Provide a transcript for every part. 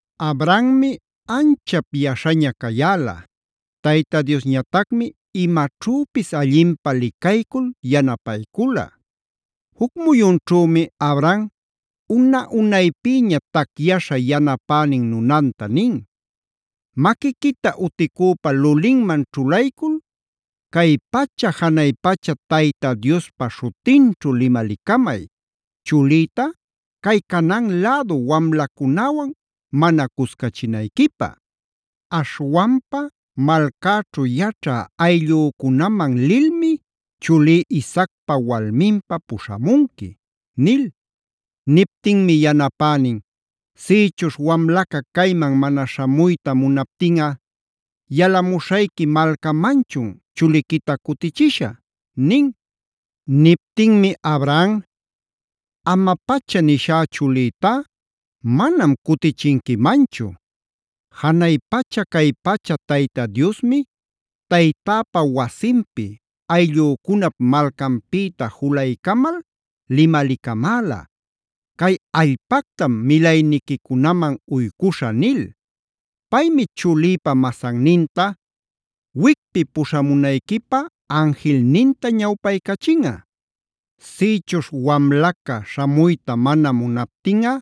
Abrahammi anchap yaśhaña cayäla; Tayta Diosñatacmi imaćhüpis allinpä licaycul yanapaycula. Juc muyunćhümi Abraham una-unaypïña tacyaśha yanapänin nunanta nin: “Maquiquita uticüpa lulinman ćhulaycul, cay pacha janay pacha Tayta Diospa śhutinćhu limalicamay, chulïta cay Canaan lädu wamlacunäwan mana cuscachinayquipä. Aśhwanpa malcäćhu yaćhä ayllücunaman lilmi chulí Isaacpa walminpä puśhamunqui” nil. Niptinmi yanapänin: “Sïchuśh wamlaca cayman mana śhamuyta munaptinꞌa, ¿yalamuśhayqui malcamanchun chuliquita cutichishä?” nin. Niptinmi Abraham: “¡Ama-pacha nishá chulïtá, manam cutichinquimanchu! Janay pacha cay pacha Tayta Diosmi taytäpa wasinpi, ayllücunap malcanpïta juluycamal limalicamäla: ‘Cay allpactam milayniquicunaman uycuśhä’ nil. Paymi chulïpa masanninta wicpi puśhamunayquipä anjilninta ñawpaycachinꞌa. Sïchuśh wamlaca śhamuyta mana munaptinꞌa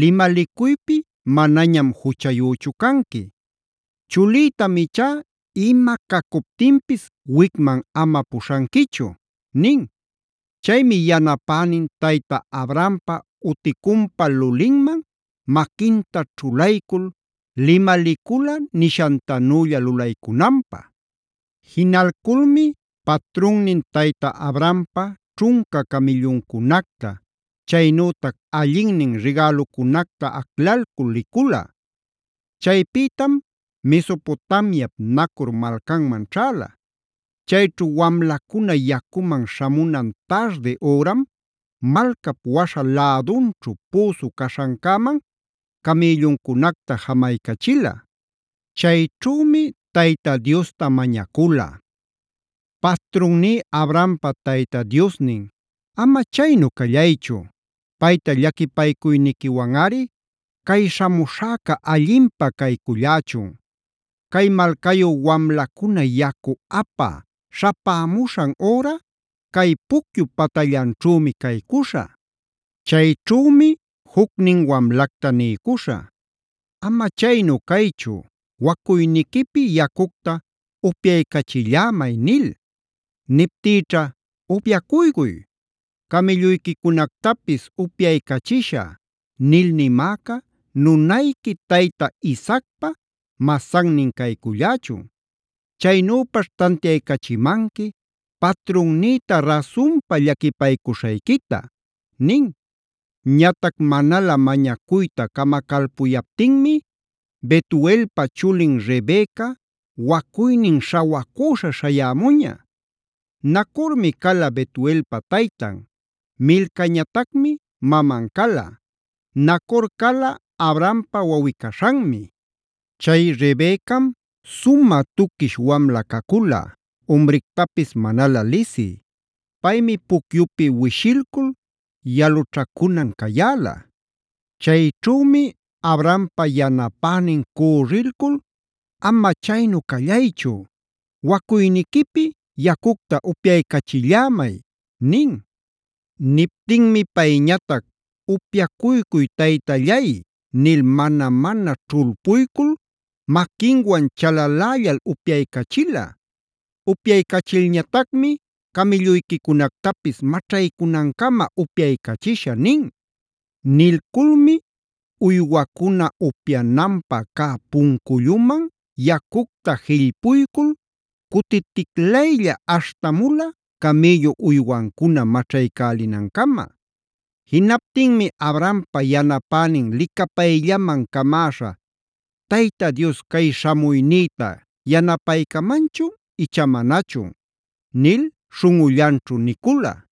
limalicuypi manañam juchayüchu canqui. Chulïtam ichá ima cacuptinpis wicman ama puśhanquichu” nin. Chaymi yanapänin tayta Abrahampa uticunpa lulinman maquinta ćhulaycul limalicula nishantanülla lulaycunanpä. Jinalculmi patrunnin tayta Abrahampa ćhunca camïlluncunacta, chaynütac allinnin rigälucunacta aclalcul licula. Chaypïtam Mesopotamiap Nacor malcanman ćhäla. Chayćhu wamlacuna yacuman śhamunan tardi üram, malcap waśha lädunćhu püsu caśhancäman camïlluncunacta jamaycachila. Chayćhümi Tayta Diosta mañacula: “Patrunní Abrahampa Tayta Diosnin, ama chaynu callaychu, payta llaquipaycuyniquiwanꞌari cay śhamuśhäca allinpä caycullächun. Cay malcayu wamlacuna yacu apä śhapämuśhan üra cay pucyup patallanćhümi caycuśhä. Chayćhümi jucnin wamlacta niycuśhä: ‘Ama chaynu caychu, wacuyniquipi yacucta upyaycachillämay’ nil. Niptïćha ‘Upyacuycuy, camïlluyquicunactapis upyaycachishä’ nil nimäca nunayqui tayta Isaacpa masannin caycullächun. Chaynüpaćh tantiaycachimanqui patrunnïta rasunpa llaquipaycuśhayquita” nin. Ñatac manalä mañacuyta camacalpuyaptinmi Betuelpa chulin Rebeca wacuynin śhawacüśha śhayämuña. Nacormi cala Betuelpa taytan; Milcañatacmi maman cala. Nacor cala Abrahampa wawꞌi-caśhanmi. Chay Rebecam sumä tuquish wamla cacula, umrictapis manalä lisï. Paymi pucyupi wishilcul yalućhacunan cayäla. Chayćhümi Abrahampa yanapänin cürrilcul: “Ama chaynu callaychu, wacuyniquipi yacucta upyaycachillämay” nin. Niptinmi payñatac: “Upyacuycuy taytallay” nil mana-mana ćhulpuycul maquinwan chalalällal upyaycachila. Upyaycachilñatacmi: “Camïlluyquicunactapis maćhaycunancama upyaycachishä” nin. Nilculmi uywacuna upyananpa cä punculluman yacucta jillpuycul cutiticlaylla aśhtamula camïllu uywancuna maćhaycälinancama. Jinaptinmi Abrahampa yanapänin licapayllaman camäśha: “¿Tayta Dios cay śhamuynïta yanapaycamanchun icha manachun?” nil śhunꞌullanćhu nicula.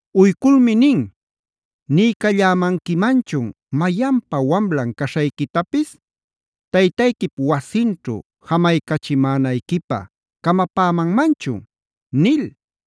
Uyculmi nin: “Niycallämanquimanchun ¿mayanpa wamlan caśhayquitapis? ¿Taytayquip wasinćhu jamaycachimänayquipä camapämanmanchun?” nil.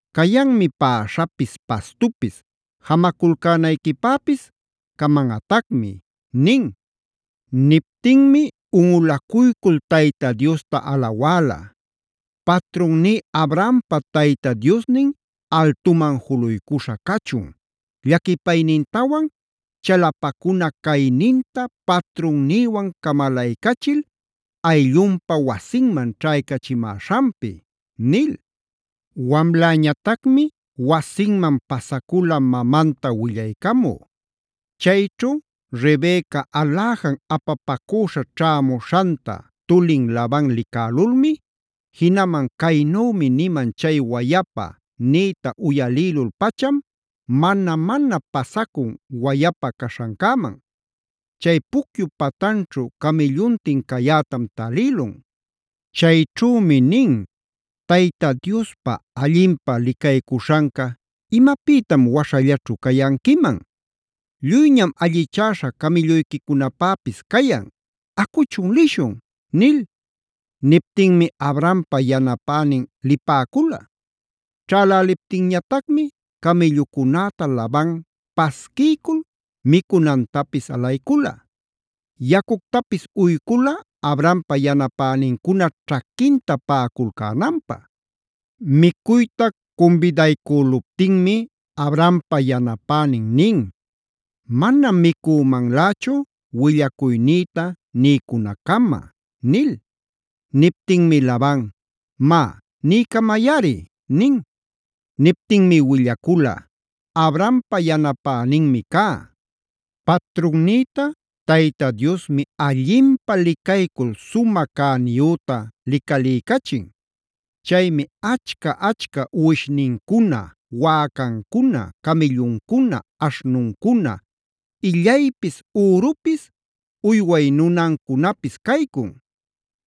Cayanmi päśhapis, pastupis; jamaculcänayquipäpis camanꞌatacmi” nin. Niptinmi unꞌulacuycul Tayta Diosta alawäla: “Patrunní Abrahampa Tayta Diosnin altuman juluycuśha cachun, llaquipaynintawan chalapacuna cayninta patrunnïwan camalaycachil ayllunpa wasinman ćhaycachimäśhanpi” nil. Wamläñatacmi wasinman pasacula mamanta willaycamü. Chayćhu Rebeca aläjan apapacüśha ćhämuśhanta tulin Laban licälulmi, jinaman “Caynümi niman chay wayapa” nïta uyalïlul-pacham mana-mana pasacun wayapa caśhancäman. Chay pucyup patanćhu camïlluntin cayätam talïlun. Chayćhümi nin: Tayta Diospa allinpä licaycuśhanca ¿imapïtam waśhallaćhu cayanquiman? Lluyñam allichäśha camïlluyquicunapäpis cayan. Acuchun lishun” nil. Niptinmi Abrahampa yanapänin lipäcula. Ćhäläliptinñatacmi camïllucunäta Laban pasquiycul micunantapis alaycula. Yacuctapis uycula Abrahampa yanapänincuna ćhaquinta paꞌaculcänanpä. Micuyta cumbidaycüluptinmi Abrahampa yanapänin nin: “Manam micümanlächu willacuynïta niycunaccama” nil. Niptinmi Laban: “Má, niycamayꞌari” nin. Niptinmi willacula: “Abrahampa yanapäninmi cá. Patrunnïta Tayta Diosmi allinpä licaycul sumä cäniyüta licaliycachin. Chaymi achca-achca uwishnincuna, wäcancuna, camïlluncuna, aśhnuncuna, illaypis, ürupis, uyway nunancunapis caycun.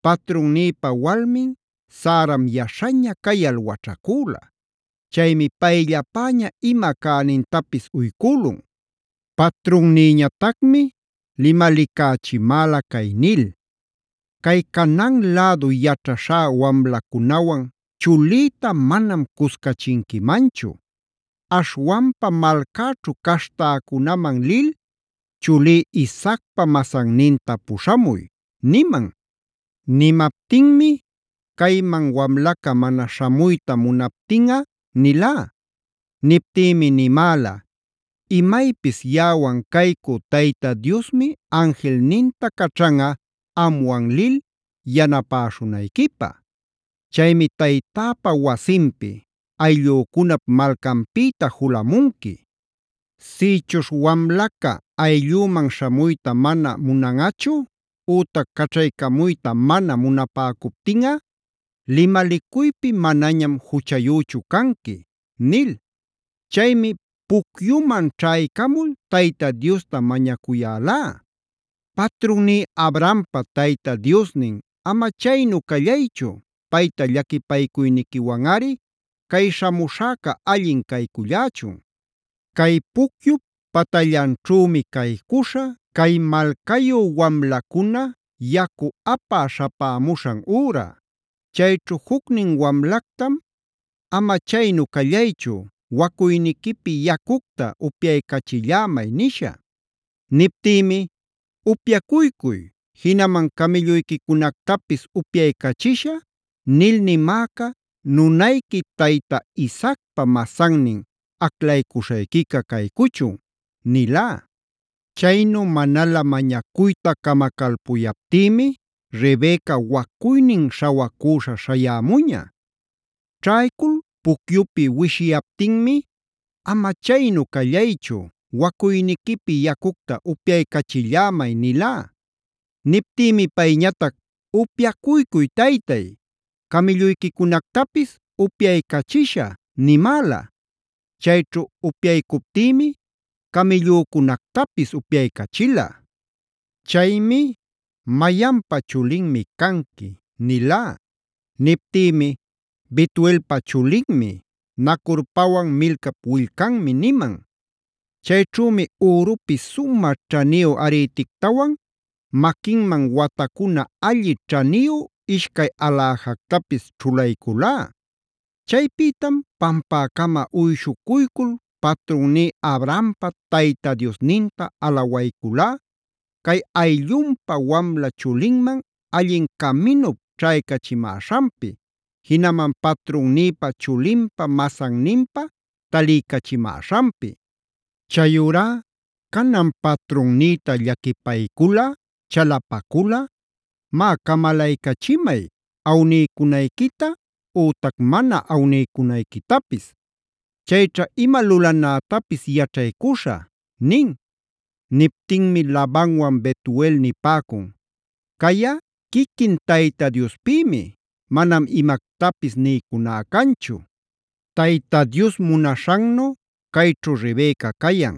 Patrunnïpa walmin Saram yaśhaña cayal waćhacüla. Chaymi payllapäña ima cänintapis uycülun. Patrunnïñatacmi limalicächimäla cay nil: ‘Cay Canaan lädu yaćhaśhá wamlacunawan chulïta manam cuscachinquimanchu. Aśhwanpa malcäćhu caśhtäcunaman lil chulí Isaacpä masanninta puśhamuy’ niman. Nimaptinmi: ‘Cayman wamlaca mana śhamuyta munaptinꞌa’ nilá. Niptïmi nimäla: ‘Imaypis yaꞌawan caycú Tayta Diosmi anjilninta caćhanꞌa amwan lil yanapäśhunayquipä. Chaymi taytäpa wasinpi, ayllücunap malcanpïta julamunqui. Sïchuśh wamlaca ayllüman śhamuyta mana munanꞌachu ütac caćhaycamuyta mana munapäcuptinꞌa, limalicuypi manañam juchayüchu canqui’ nil. “Chaymi pucyuman ćhaycamul Tayta Diosta mañacuyälá: ‘Patrunní Abrahampa Tayta Diosnin, ama chaynu callaychu payta llaquipaycuyniquiwanꞌari cay śhamuśhäca allin caycullächun. Cay pucyup patallanćhümi caycuśhä cay malcayu wamlacuna yacu apä śhapämuśhan üra. Chayćhu jucnin wamlactam: Ama chaynu callaychu wacuyniquipi yacucta upyaycachillämay’ nishä. Niptïmi: ‘Upyacuycuy, jinaman camïlluyquicunactapis upyaycachishä nil nimäca nunayqui tayta Isaacpa masannin aclaycuśhayquica caycuchun’ nilá. Chaynu manalä mañacuyta camacalpuyaptïmi Rebeca wacuynin śhawacüśha śhayämuña. Ćhaycul pucyupi wishiyaptinmi: ‘Ama chaynu callaychu, wacuyniquipi yacucta upyaycachillämay’ nilá. Niptïmi payñatac: ‘Upyacuycuy taytay, camïlluyquicunactapis upyaycachishä’ nimäla. Chayćhu upyaycuptïmi camïllücunactapis upyaycachila. Chaymi: ‘¿Mayanpa chulinmi canqui?’ nilá. Niptïmi: ‘Betuelpa chulinmi, Nacorpawan Milcap willcanmi’ niman. Chayćhümi ürupi sumä ćhaniyu arïtictawan maquinman watacuna alli ćhaniyu ishcay aläjactapis ćhulayculá. Chaypïtam pampäcama uyshucuycul patrunní Abrahampa Tayta Diosninta alawayculá cay ayllunpa wamla chulinman allin caminup ćhaycachimäśhanpi, jinaman patrunnïpa chulinpä masanninpä taliycachimäśhanpi. Chayurá canan patrunnïta llaquipayculꞌa, chalapaculꞌa má camalaycachimay, awniycunayquita ütac mana awniycunayquitapis. Chayćha ima lulanätapis yaćhaycuśhä” nin. Niptinmi Labanwan Betuel nipäcun: “Cayꞌa quiquin Tayta Diospïmi, manam imactapis niycuná canchu. Tayta Dios munaśhannu cayćhu Rebeca cayan;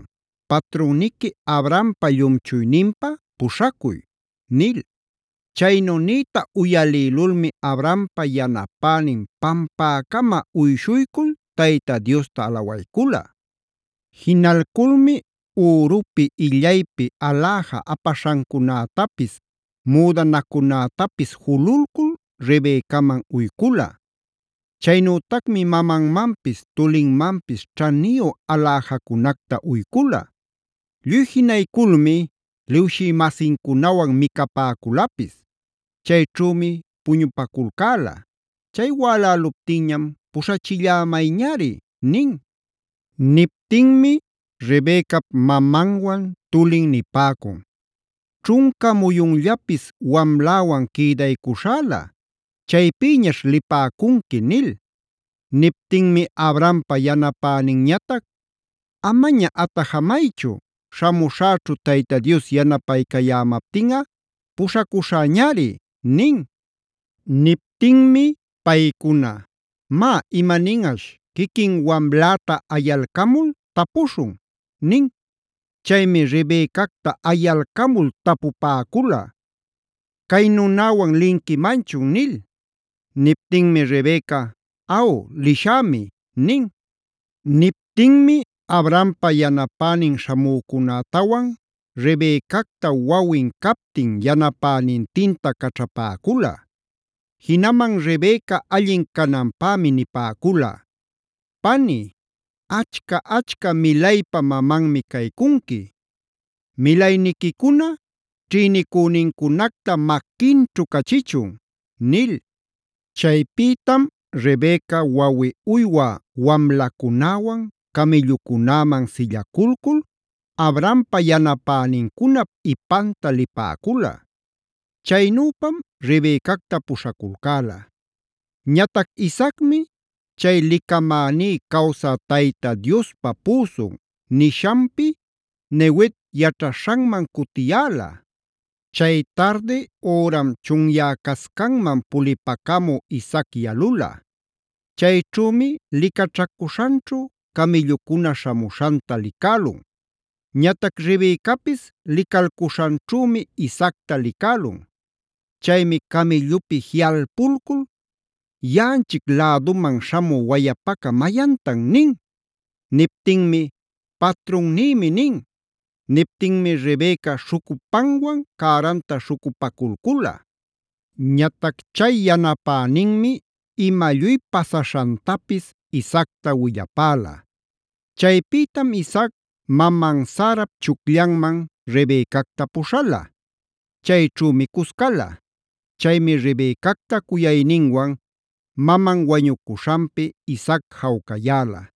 patrunniqui Abrahampa llumchuyninpä puśhacuy” nil. Chaynu nïta uyalïlulmi Abrahampa yanapänin pampäcama uyshuycul Tayta Diosta alawaycula. Jinalculmi ürupi illaypi aläja apaśhancunätapis, müdanacunätapis jululcul Rebecaman uycula. Chaynütacmi mamanmanpis tulinmanpis ćhaniyu aläjacunacta uycula. Lluy jinayculmi liwshï-masincunawan micapäculapis. Chayćhümi puñupaculcäla; chay wäläluptinñam: “Puśhachillämayñari” nin. Niptinmi Rebecap mamanwan tulin nipäcun: “Ćhunca muyunllapis wamläwan quïdaycuśhäla; chaypïñaćh lipäcunqui” nil. Niptinmi Abrahampa yanapäninñatac: “Amaña atajamaychu, śhamuśhäćhu Tayta Dios yanapaycayämaptinꞌa; puśhacuśhäñari” nin. Niptinmi paycuna: “Má imaninꞌaśh, quiquin wamläta ayalcamul tapuśhun” nin. Chaymi Rebecacta ayalcamul tapupäcula: “¿Cay nunäwan linquimanchun?” nil. Niptinmi Rebeca: “Aw, lishämi” nin. Niptinmi Abrahampa yanapänin śhamücunätawan Rebecacta wawin captin yanapänintinta caćhapäcula. Jinaman Rebeca allin cananpämi nipäcula: “Pani, ¡achca-achca milaypa mamanmi caycunqui! ¡Milayniquicuna ćhïnicünincunacta maquinćhu cachichun!” nil. Chaypïtam Rebeca wawi uywä wamlacunäwan camïllucunäman sillaculcul Abrahampa yanapänincunap ipanta lipäcula. Chaynüpam Rebecacta puśhaculcäla. Ñatac Isaacmi chay “Licamäní cawsä Tayta Diospa püsun” nishanpi Neguev yaćhaśhanman cutiyäla. Chay tardi üram chunyäcascanman pulipacamü Isaac yalula. Chayćhümi licaćhacuśhanćhu camïllucuna śhamuśhanta licälun. Ñatac Rebecapis licalcuśhanćhümi Isaacta licälun. Chaymi camïllupi jiꞌalpulcul: “¿Yaꞌanchic läduman śhamü wayapaca mayantan?” nin. Niptinmi: “Patrunnïmi” nin. Niptinmi Rebeca śhucupanwan cäranta śhucupaculcula. Ñatac chay yanapäninmi ima lluy pasaśhantapis Isaacta willapäla. Chaypïtam Isaac maman Sarap chucllanman Rebecacta puśhala. Chayćhümi cuscala. Chaymi Rebecacta cuyayninwan maman wañucuśhanpi Isaac jawcayäla.